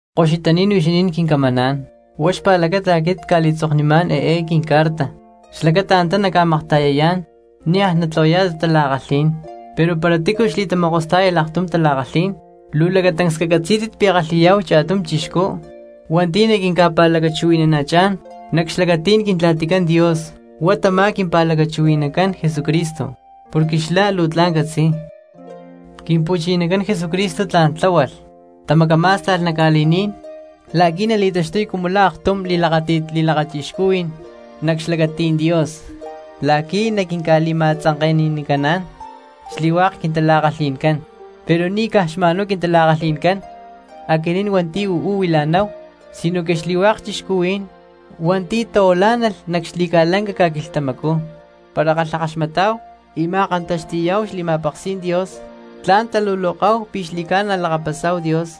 Koxutaní̠n huixinín quincamaná̠n, huá xpa̠lacata aquit cca̠li̠tzoknimá̠n eé quincarta xlacata antá nacca̠makta̠yayá̠n niaj natlahuayá̠tit tala̠kalhí̠n. Pero para tícu xli̠tamokostá̠yalh aktum tala̠kalhí̠n luu lacatancs cacatzí̠tit pi̠ kalhi̠yá̠hu cha̠tum chixcú hua̠nti̠ naquinca̠pa̠lacachuhui̠nana̠chá̠n nac xlacatí̠n Quintla̠ticán Dios, huá tamá quimpa̠lacachuhui̠nacán Jesucristo porque xlá luu tla̠n catzi̠y. Quimpu̠chinacán Jesucristo tla̠n tláhualh, tamacamá̠sta̠lh nac ca̠li̠ní̠n la̠qui̠ nali̠taxtuy cumu la̠ aktum xatamaakxtakajní̠n li̠lakachixcuhui̠n nac xlacatí̠n Dios la̠qui̠ naquinca̠li̠ma̠tzanke̠nanicaná̠n xli̠hua̠k quintala̠kalhi̠ncán; pero ni̠ caj xma̠nhuá quintala̠kalhi̠ncán aquinín hua̠nti̠ uú huila̠náhu, sinoque xli̠hua̠k cristianos hua̠nti̠ tahuilá̠nalh nac xli̠ca̠lanca ca̠quilhtamacú. Para kalhakaxmatá̠hu y ma̠kantaxti̠ma̠náhu xli̠ma̠peksí̠n Dios, tla̠n taluloká̠hu pi̠ xli̠ca̠na lakapasá̠hu Dios.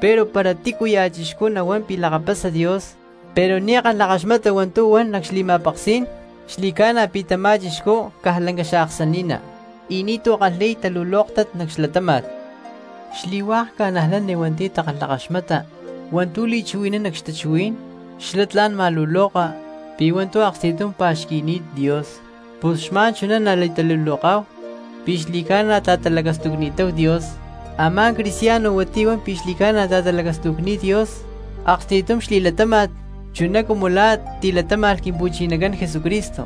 Pero para tícuya̠ cristiano nahuán pi̠ lakapasa Dios pero ni̠ kalhakaxmata hua̠ntu̠ huan nac xli̠ma̠peksí̠n, xli̠ca̠na pi̠ tamá cristiano caj lanca xaaksani̠ná y ni̠tu̠ kalhi̠y talulóktat nac xlatáma̠t. Xli̠hua̠k cristianos hua̠nti̠ takalhakaxmata hua̠ntu̠ li̠chuhui̠nán nac xtachuhuí̠n, xlá tla̠n ma̠luloka pi̠ hua̠ntu̠ aksti̠tum pa̠xqui̠ni̠t Dios, pus xma̠n chuná nali̠taluloká̠hu pi̠ xli̠ca̠na ta̠talacastucni̠táhu Dios. Amá cristiano hua̠nti̠ huan pi̠ xli̠ca̠na ta̠talacastucni̠t Dios aksti̠tum xli̠latáma̠t chuná cumu la̠ tilatáma̠lh Quimpu̠chinacán Jesucristo.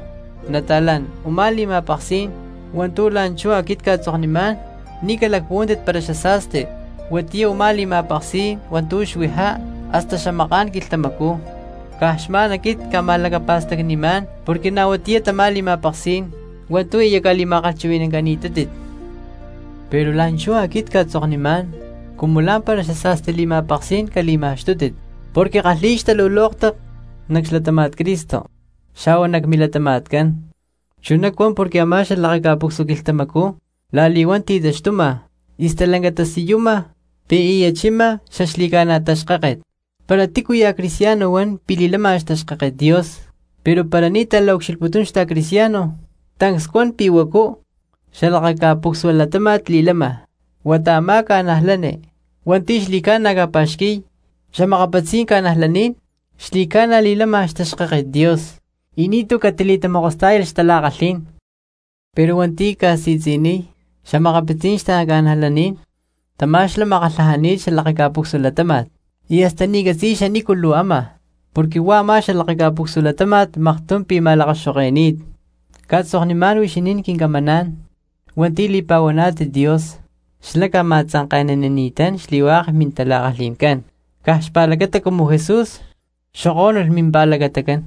Nata̠lán, u̠má li̠ma̠peksí̠n hua̠ntu̠ la̠nchú aquit cca̠tzoknimá̠n ni̠ calacpuhuántit para xasa̠sti; huatiyá u̠má li̠ma̠peksí̠n hua̠ntu̠ xuijá hasta xamaká̠n quilhtamacú, caj xma̠n aquit cca̠ma̠lacapa̠stacni̠má̠n porque na̠ huatiyá tamá li̠ma̠peksí̠n hua̠ntu̠ aya ca̠li̠ma̠kalhchuhui̠ni̠cani̠tátit. Pero la̠nchú aquit cca̠tzoknimá̠n, cumu lá̠mpara xasa̠sti li̠ma̠peksí̠n cali̠ma̠xtútit porque kalhi̠y xtalulóktat nac xlatáma̠t Cristo xa̠hua nac milatama̠tcán, chuná cuan porque a̠má xalakaca̠pucsua quilhtamacú la̠li̠huán ti̠taxtuma y stalanca tasiyuma pi̠ aya chima xaxli̠ca̠na taxkáket. Para tícuya̠ cristiano huan pi̠ li̠lama xtaxkáket Dios pero para ni̠ ta̠la̠ucxilhputún xta̠cristiano, tancs cuan pi̠ huacu cxalakaca̠pucsua latáma̠t li̠lama. Huata a̠má cristiano hua̠nti̠ xli̠ca̠na ca̠pa̠xqui̠y xa̠makapitzí̠n xta̠cristianos xli̠ca̠na li̠lama xtaxkáket Dios y ni̠tu̠ catili̠tamokostá̠yalh xtala̠kalhí̠n. Pero hua̠nti̠ ca̠si̠tzi̠niy xa̠makapitzí̠n xta̠cristianos tamá xlá makatlajani̠t xalakaca̠pucsua latáma̠t, y hasta ni̠ catzi̠y xanícu luu áma porque huá a̠má xalakaca̠pucsua latáma̠t maktum pi̠ ma̠lakaxo̠ke̠ni̠t. Cca̠tzoknunimá̠n huixinín quincamaná̠n hua̠nti̠ li̠pa̠huaná̠tit Dios, xlá ca̠ma̠tzanke̠nanini̠tán xli̠hua̠k mintala̠kalhi̠ncán caj xpa̠lacata cumu Jesús xokó̠nulh mimpa̠lacatacán.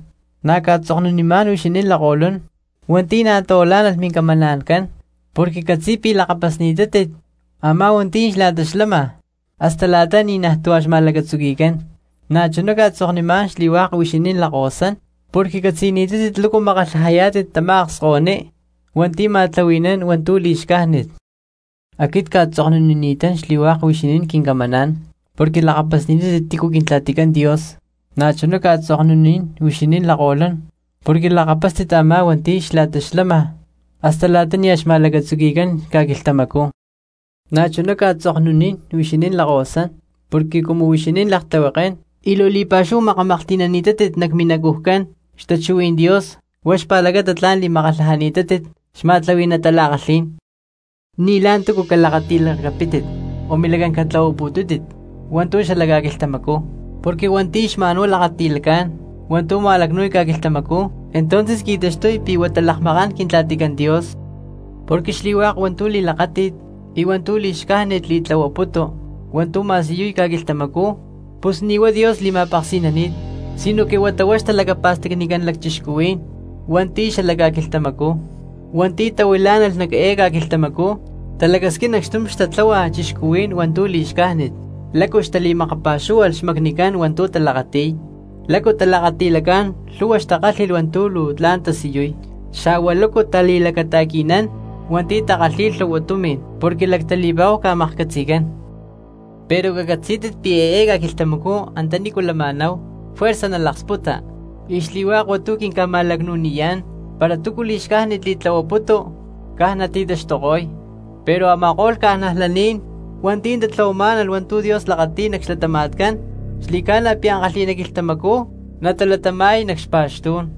Na̠ cca̠tzoknunimá̠n huixinín lakko̠lún hua̠nti̠ na̠ tahuilá̠nalh mincamana̠ncán porque ccatzi̠y pi̠ lakapasni̠tátit a̠má hua̠nti̠ xla̠ta xlama hasta la̠ta ni̠najtú a̠ xma̠lacatzuqui̠cán. Na̠chuná cca̠tzoknimá̠n xli̠hua̠k huixinín lakahuasán porque catzi̠ni̠tátit lácu namakatlajayá̠tit tamá akskahuiní hua̠nti̠ ma̠tlahui̠nán hua̠ntu̠ li̠xcájnit. Aquit cca̠tzoknunini̠tán xli̠hua̠k huixinín quincamaná̠n porque lakapasni̠tátit tícu Quintla̠ticán Dios. Na̠chuná cca̠tzoknunín huixinín lakko̠lún porque lakapástit a̠má hua̠nti̠ xla̠ta xlama hasta la̠ta nia̠ xma̠lacatzuqui̠cán ca̠quilhtamacú. Na̠chuná cca̠tzoknunín huixinín lakkahuasán porque cumu huixinín laktlihuekén y luu li̠pa̠xúhu makamaklhti̠nani̠tátit nac minacujcán xtachuhuí̠n Dios huá xpa̠lacata tla̠n li̠makatlajani̠tátit xma̠tlahui̠ná tala̠kalhí̠n. Ni̠ la̠ntúcu calakati̠lacapítit o milacán catlahuaputútit hua̠ntu̠ xala ca̠quilhtamacú. Porque hua̠nti̠ xma̠n huá lakati̠lacá̠n hua̠ntu̠ ma̠lacnu̠y ca̠quilhtamacú, entonces qui̠taxtuy pi̠ huata lakmakán Quintla̠ticán Dios. Porque xli̠hua̠k hua̠ntu̠ li̠lakáti̠t y hua̠ntu̠ li̠xcájnit li̠tlahuaputu hua̠ntu̠ ma̠siyuy ca̠quilhtamacú, pus ni̠ huá Dios li̠ma̠peksi̠nani̠t, sinoque huata huá xtalacapa̠stacnicán cristianos hua̠nti̠ xala ca̠quilhtamacú. Hua̠nti̠ tahuilá̠nalh nac eé ca̠quilhtamacú talacasquín acxtum xtatláhualh cristianos hua̠ntu̠ li̠xcájnit, lácu xtali̠makapa̠xúhualh xmacnicán hua̠ntu̠ talakati̠y, lácu talakati̠lacá̠n lhu̠hua xtakálhi̠lh hua̠ntu̠ luu tla̠n tasiyuy, xa̠hua lácu tali̠lacata̠qui̠nán hua̠nti̠ takalhi̠y lhu̠hua tumi̠n porque lactali̠pa̠hu ca̠maklhcatzi̠cán. Pero cacatzí̠tit pi̠ eé ca̠quilhtamacú antanícu lama̠náhu juerza nalaksputa, y xli̠hua̠k hua̠ntu̠ quinca̠ma̠lacnu̠niyá̠n para túcu li̠xcájnit li̠tlahuaputu caj nati̠taxtuko̠y, pero a̠ma̠ko̠lh cristianos hua̠nti̠ tatlahuamá̠nalh hua̠ntu̠ Dios lakati̠y nac xlatama̠tcán xli̠ca̠na pi̠ ankalhi̠ná quilhtamacú natalatama̠y nac xpa̠xtú̠n.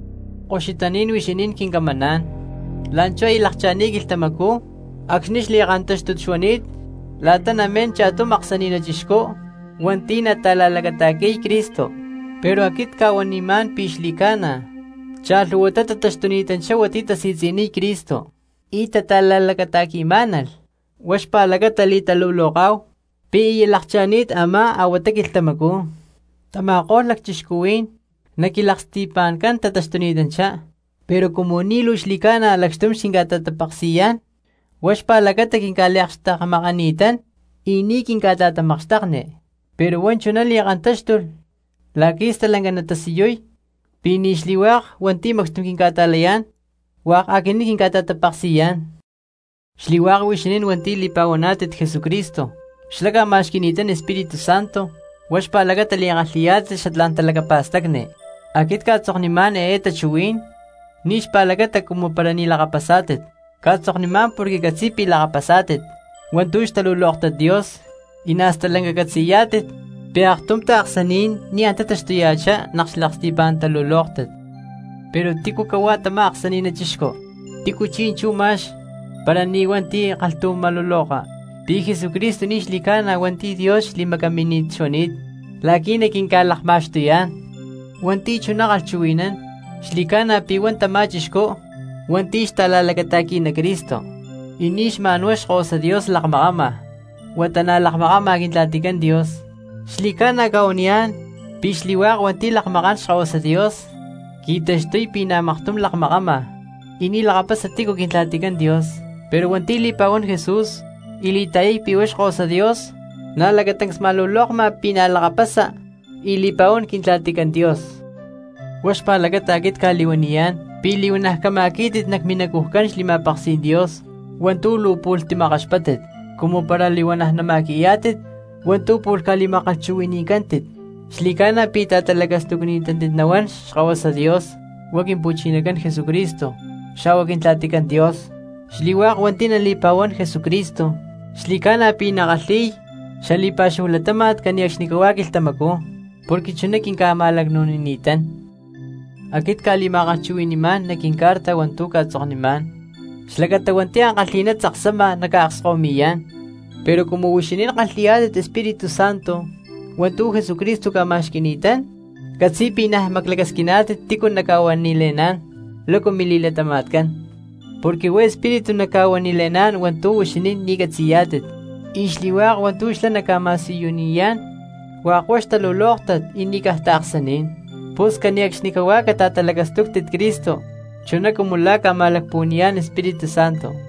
Koxutaní̠n huixinín quincamaná̠n, la̠nchú aya lakcha̠ni̠t quilhtamacú acxni̠ xli̠kantáxtut xuani̠t la̠ta namín cha̠tum aksani̠na̠ chixcú hua̠nti̠ nata̠la̠lacata̠qui̠y Cristo, pero aquit cca̠huanimá̠n pi̠ xli̠ca̠na cha̠lhu̠huatá taxtuni̠tanchá hua̠nti̠ tasi̠tzi̠niy Cristo y tata̠la̠lacata̠qui̠má̠nalh, huá xpa̠lacata li̠taluloká̠hu pi̠ aya lakcha̠ni̠t a̠má a̠huatá quilhtamacú. Tama̠ko̠lh lacchixcuhuí̠n, nac quilaksti̠pa̠ncán tataxtuni̠tanchá, pero cumu ni̠ luu xli̠ca̠na lacxtum xquinca̠ta̠tapeksi̠yá̠n huá xpa̠lacata quinca̠liakxtekmakani̠tán y ni̠ quinca̠ta̠tamakxtekni. Pero huá chuná li̠kantáxtulh la̠qui̠ stalanca natasiyuy pi̠ ni̠ xli̠hua̠k hua̠nti̠ macxtum quinca̠ta̠layá̠n hua̠k aquinín quinca̠ta̠tapeksi̠yá̠n. Xli̠hua̠k huixinín hua̠nti̠ li̠pa̠huaná̠tit Jesucristo, xlá ca̠ma̠xqui̠ni̠tán Espíritu Santo, huá xpa̠lacata li̠kalhi̠yá̠tit xatlá̠n talacapa̠stacni. Aquit cca̠tzoknimá̠n eé tachuhuí̠n ni̠ xpa̠lacata cumu para ni̠ lakapasá̠tit, cca̠tzoknimá̠n porque ccatzi̠y pi̠ lakapasá̠tit hua̠ntu̠ xtalulóktat Dios y na̠ stalanca catzi̠yá̠tit pi̠ aktum taaksaní̠n ni̠ antá taxtuya̠chá nac xlaksti̠pá̠n talulóktat. Pero, ¿tícu cahuá tamá aksani̠na̠ chixcú? Tícu chi̠nchú ma̠x para ni̠ hua̠nti̠ kalhtum ma̠luloka pi̠ Jesucristo ni̠ xli̠ca̠na hua̠nti̠ Dios xli̠macamínit xuani̠t la̠qui̠ naquinca̠lakma̠xtuyá̠n. Hua̠nti̠ chuná kalhchuhui̠nán xli̠ca̠na pi̠ huá tamá cristiano hua̠nti̠ xta̠la̠lacata̠qui̠ná Cristo, y ni̠ xma̠n huá Xkahuasa Dios lakmakama huata na̠ lakmakama Quintla̠ticán Dios. Xli̠ca̠na cca̠huaniyá̠n pi̠ xli̠hua̠k hua̠nti̠ lakmakán Xkahuasa Dios, qui̠taxtuy pi̠ na̠ maktum lakmakama y ni̠ lakapasa tícu Quintla̠ticán Dios; pero hua̠nti̠ li̠pa̠huán Jesús y li̠ta̠yay pi̠ Xkahuasa Dios, na̠ lacatancs li̠ma̠lulokma pi̠ na̠ lakapasa y li̠pa̠huán Quintla̠ticán Dios. Huá xpa̠lacata aquit cca̠li̠huaniyá̠n pi̠ li̠huana̠ cama̠quí̠tit nac minacujcán xli̠ma̠peksí̠n Dios hua̠ntu̠ luu pu̠lh timakkaxpáttit; cumu para li̠huana̠ nama̠qui̠yá̠tit hua̠ntu̠ pu̠lh ca̠li̠ma̠kalhchuhui̠ni̠cántit, xli̠ca̠na pi̠ ta̠talacastucni̠tátit nahuán Xkahuasa Dios huá Quimpu̠chinacán Jesucristo xa̠hua Quintla̠ticán Dios. Xli̠hua̠k hua̠nti̠ nali̠pa̠huán Jesucristo xli̠ca̠na pi̠ nakalhi̠y xali̠pa̠xúhu latáma̠t cane̠cxnicahuá quilhtamacú porque chuná quinca̠ma̠lacnu̠nini̠tán. Aquit cca̠li̠ma̠kalhchuhui̠ni̠má̠n nac quincarta hua̠ntu̠ cca̠tzoknimá̠n xlacata hua̠nti̠ ankalhi̠ná tzaksama naca̠akskahuimi̠yá̠n. Pero cumu huixinín kalhi̠yá̠tit Espíritu Santo hua̠ntu̠ Jesucristo ca̠ma̠xqui̠ni̠tán, ccatzi̠y pi̠ niaj maclacasquiná̠tit tícu naca̠huanile̠ná̠n lácu mili̠latama̠tcán, porque huá Espíritu naca̠huanile̠ná̠n hua̠ntu̠ huixinín ni̠ catzi̠yá̠tit, y xli̠hua̠k hua̠ntu̠ xlá naca̠ma̠siyuniyá̠n hua̠k huá xtalulóktat y ni̠ caj taaksaní̠n. Pus cane̠cxnicahuá cata̠talacastúctit Cristo chuná cumu la̠ ca̠ma̠lacpuhua̠ni̠yá̠n Espíritu Santo.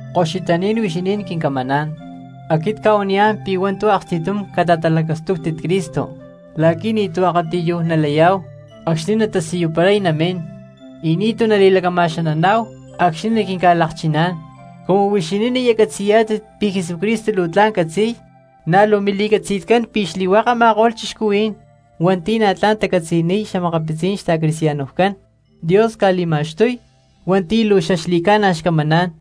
Koxutaní̠n huixinín quincamaná̠n, aquit cca̠huaniyá̠n pi̠ hua̠ntu̠ aksti̠tum cata̠talacastúctit Cristo la̠qui̠ ni̠tu̠ akatiyuj nalayá̠hu acxni̠ natasiyuparay namín, y nítú nali̠lacama̠xananá̠hu acxni̠ naquinca̠lakchiná̠n. Cumu huixinín aya catzi̠yá̠tit pi̠ Jesucristo luu tla̠n catzi̠y, na̠ luu mili̠catzi̠tcán pi̠ xli̠hua̠k a̠ma̠ko̠lh cristianos hua̠nti̠ na̠ tla̠n tacatzi̠niy xa̠makapitzí̠n xta̠cristianoscán Dios ca̠li̠ma̠xtuy hua̠nti̠ luu xaxli̠ca̠na xcamaná̠n.